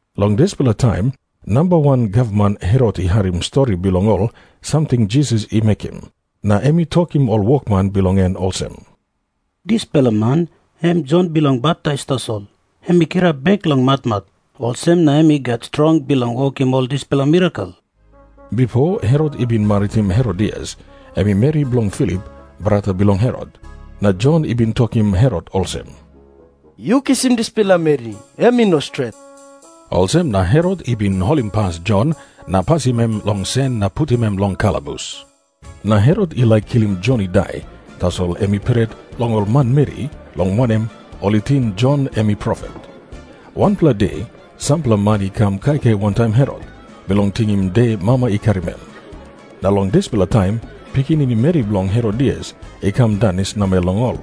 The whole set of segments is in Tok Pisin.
Long dispela taim namba wan gavman Herot i harim stori bilong ol samting Jisas i mekim, na em i tokim ol wokman bilong en olsem, "Dispela man em Jon Bilong Baptais tasol. Em i kirap bek long matmat. Olsem na em i gat strong bilong wokim ol dispela mirakel." Bipo Herot i bin maritim Herodias, em meri bilong Filip, brata bilong Herot. Na Jon i bin tokim Herot olsem, "Yu kisim dispela meri, em i no stret." Olsem na Herot i bin holimpas Jon na pasim em long sen na putim em long kalabus. Na Herot i laik kilim Jon i dai, tasol em i pret long ol manmeri, long wanem, ol i ting Jon em i profet. Wanpela de sampela man i kam kaikai wantaim Herot, bilong tingim de mama i karim em. Na long dispela taim pikinini meri bilong Herodias i kam danis namel long ol.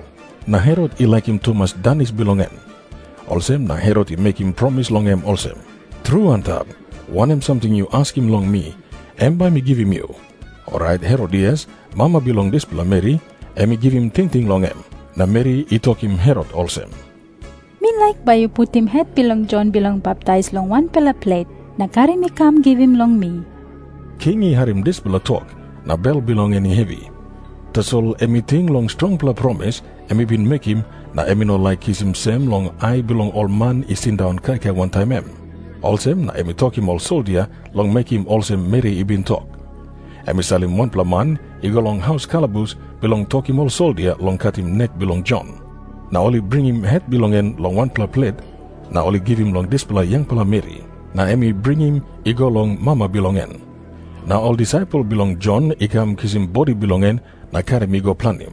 Na Herot i laikim tumas danis bilong en. Olsem na Herot i mekim promis long em olsem, "Tru antap, wanem samting yu askim long mi, em bai mi givim yu." Orait Herodias, mama bilong dispela meri, em i givim tingting long em, na meri i tokim Herot olsem, "Mi laik bai yu putim het bilong Jon Bilong Baptais long wanpela plet, na karim i kam givim long mi." King i harim dispela tok, na bel bilong en i hevi. Tasol em i ting long strongpela promis em i bin mekim, na em i no laik kisim sem long ai bilong ol man i sindaun kaikai wantaim em. Olsem na em i tokim ol soldia long mekim olsem meri i bin tok. Em i salim wanpela man i go long haus kalabus bilong tokim ol soldia long katim nek bilong Jon. Na ol i bringim het bilong en long wanpela plet, na ol i givim long dispela yangpela meri. Na em i bringim i go long mama bilong en. Na ol disaipel bilong Jon i kam kisim bodi bilong en na karim i go planim.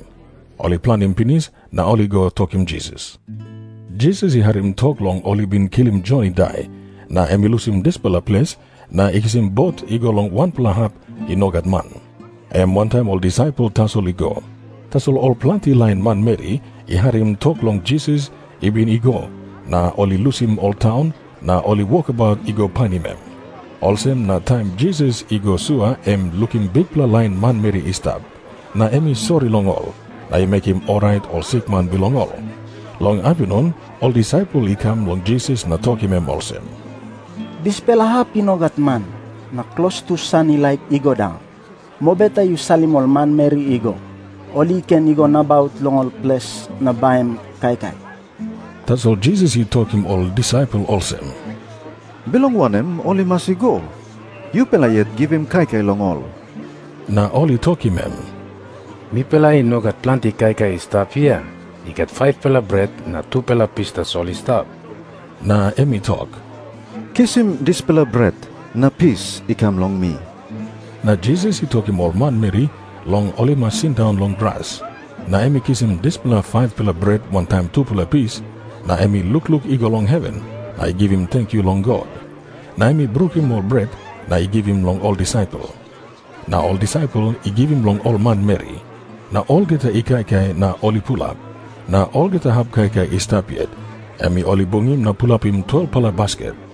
Ol i planim pinis, na ol i go tokim Jisas. Jisas i harim tok long ol i bin kilim Jon i dai, na em i lusim dispela ples na i kisim bot i go long wanpela hap i no gat man. Em wantaim ol disaipel tasol i go. Tasol ol planti lain manmeri i harim tok long Jisas i bin i go, na ol i lusim ol taun, na ol i wokabaut i go painim em. Olsem na taim Jisas i go sua em i lukim bikpela lain manmeri i stap. Na em i sori long ol, na i mekim orait ol sikman bilong ol. Long apinun ol disaipel i kam long Jisas na tokim em olsem, "Dispela hap i no gat man, na klostu san i laik i go daun. Mobeta yu salim ol manmeri i go. Ol i ken i go nabaut long ol ples na baim kaikai." Tasol Jisas i tokim ol disaipel olsem, "Bilong wanem ol i mas i go? Yupela yet givim kaikai long ol." Na ol i tokim em, "Mipela i no gat planti kaikai i stap hia. I gat 5-pela bret na tupela pis tasol i stap." Na em i tok, "Kisim dispela bret na pis i kam long mi." Na Jisas i tokim ol manmeri long ol i mas sindaun long gras. Na em i kisim dispela 5-pela bret wantaim tupela pis, na em i lukluk i go long heven, na i givim tenkyu long God. Na em i brukim ol bret na i givim long ol disaipel. Na ol disaipel i givim long ol manmeri, na olgeta i kaikai na ol i pulap. Na olgeta hap kaikai i stap yet, em ol i bungim na pulapim 12-pela basket.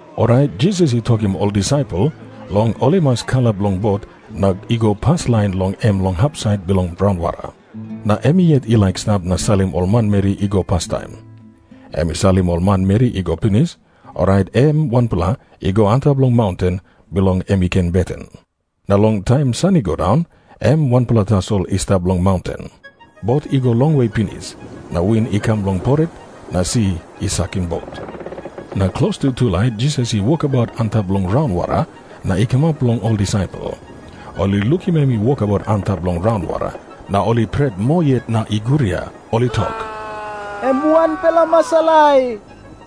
Orait Jisas i tokim ol disaipel long ol i mas kalap long bot na i go paslain long em long hapsait bilong raunwara. Na em yet i laik i stap na salim ol manmeri i go pastaim. Em i salim ol manmeri i go pinis, orait em wanpela i go antap long maunten, bilong em i ken beten. Na long taim san i go daun, em wanpela tasol i stap long maunten. Bot i go longwe pinis, na win i kam long poret, na si i sakim bot. Na klostu tulait Jisas i wokabaut antap long raunwara na i kamap long ol disaipel. Ol i lukim em i wokabaut antap long raunwara, na ol i pret moa yet na i guria. Ol i tok, "Em wanpela masalai."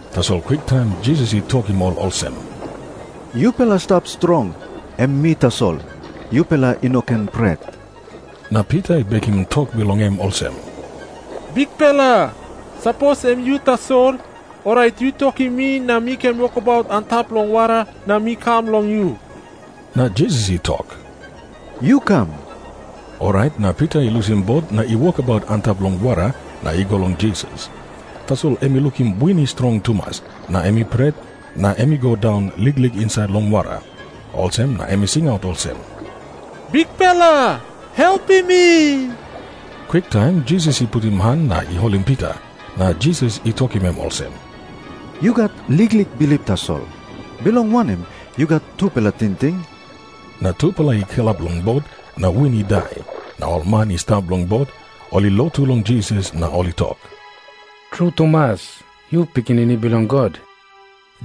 Tasol kwiktaim Jisas i tokim ol olsem, "Yupela stap strong. Em mi tasol. Yupela i no ken pret." Na Pita i bekim tok bilong em olsem, "Bikpela, sapos em yu tasol, orait yu tokim mi na mi ken wokabaut antap long wara na mi kam long yu." Na Jisas i tok, "Yu kam." Orait na Pita i lusim bot na i wokabaut antap long wara na i go long Jisas. Tasol em i lukim win i strong tumas na em i pret, na em i go daun liklik insait long wara. Olsem na em i singaut olsem, "Bikpela, helpim mi." Kwiktaim Jisas i putim han na i holim Pita. Na Jisas i tokim em olsem, "Yu gat liklik bilip tasol. Bilong wanem yu gat tupela tingting?" Na tupela i kalap long bot, na win i dai. Na ol man i stap long bot, ol i lotu long Jisas na ol i tok, "Tru tumas, yu Pikinini Bilong God."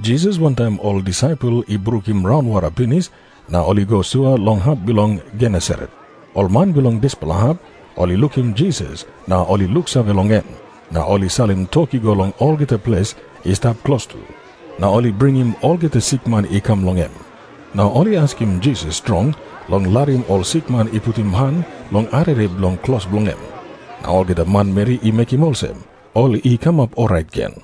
Jisas wantaim ol disaipel i brukim raunwara pinis na ol i go sua long hap bilong Genesaret. Ol man bilong dispela hap ol i lukim Jisas na ol i luksave long em, na ol i salim tok i go long olgeta ples i stap klostu, na ol i bringim olgeta sikman i kam long em. Na ol i askim Jisas strong long larim ol sikman i putim han long arere bilong klos bilong em. Na olgeta manmeri i mekim olsem, ol i kamap orait gen.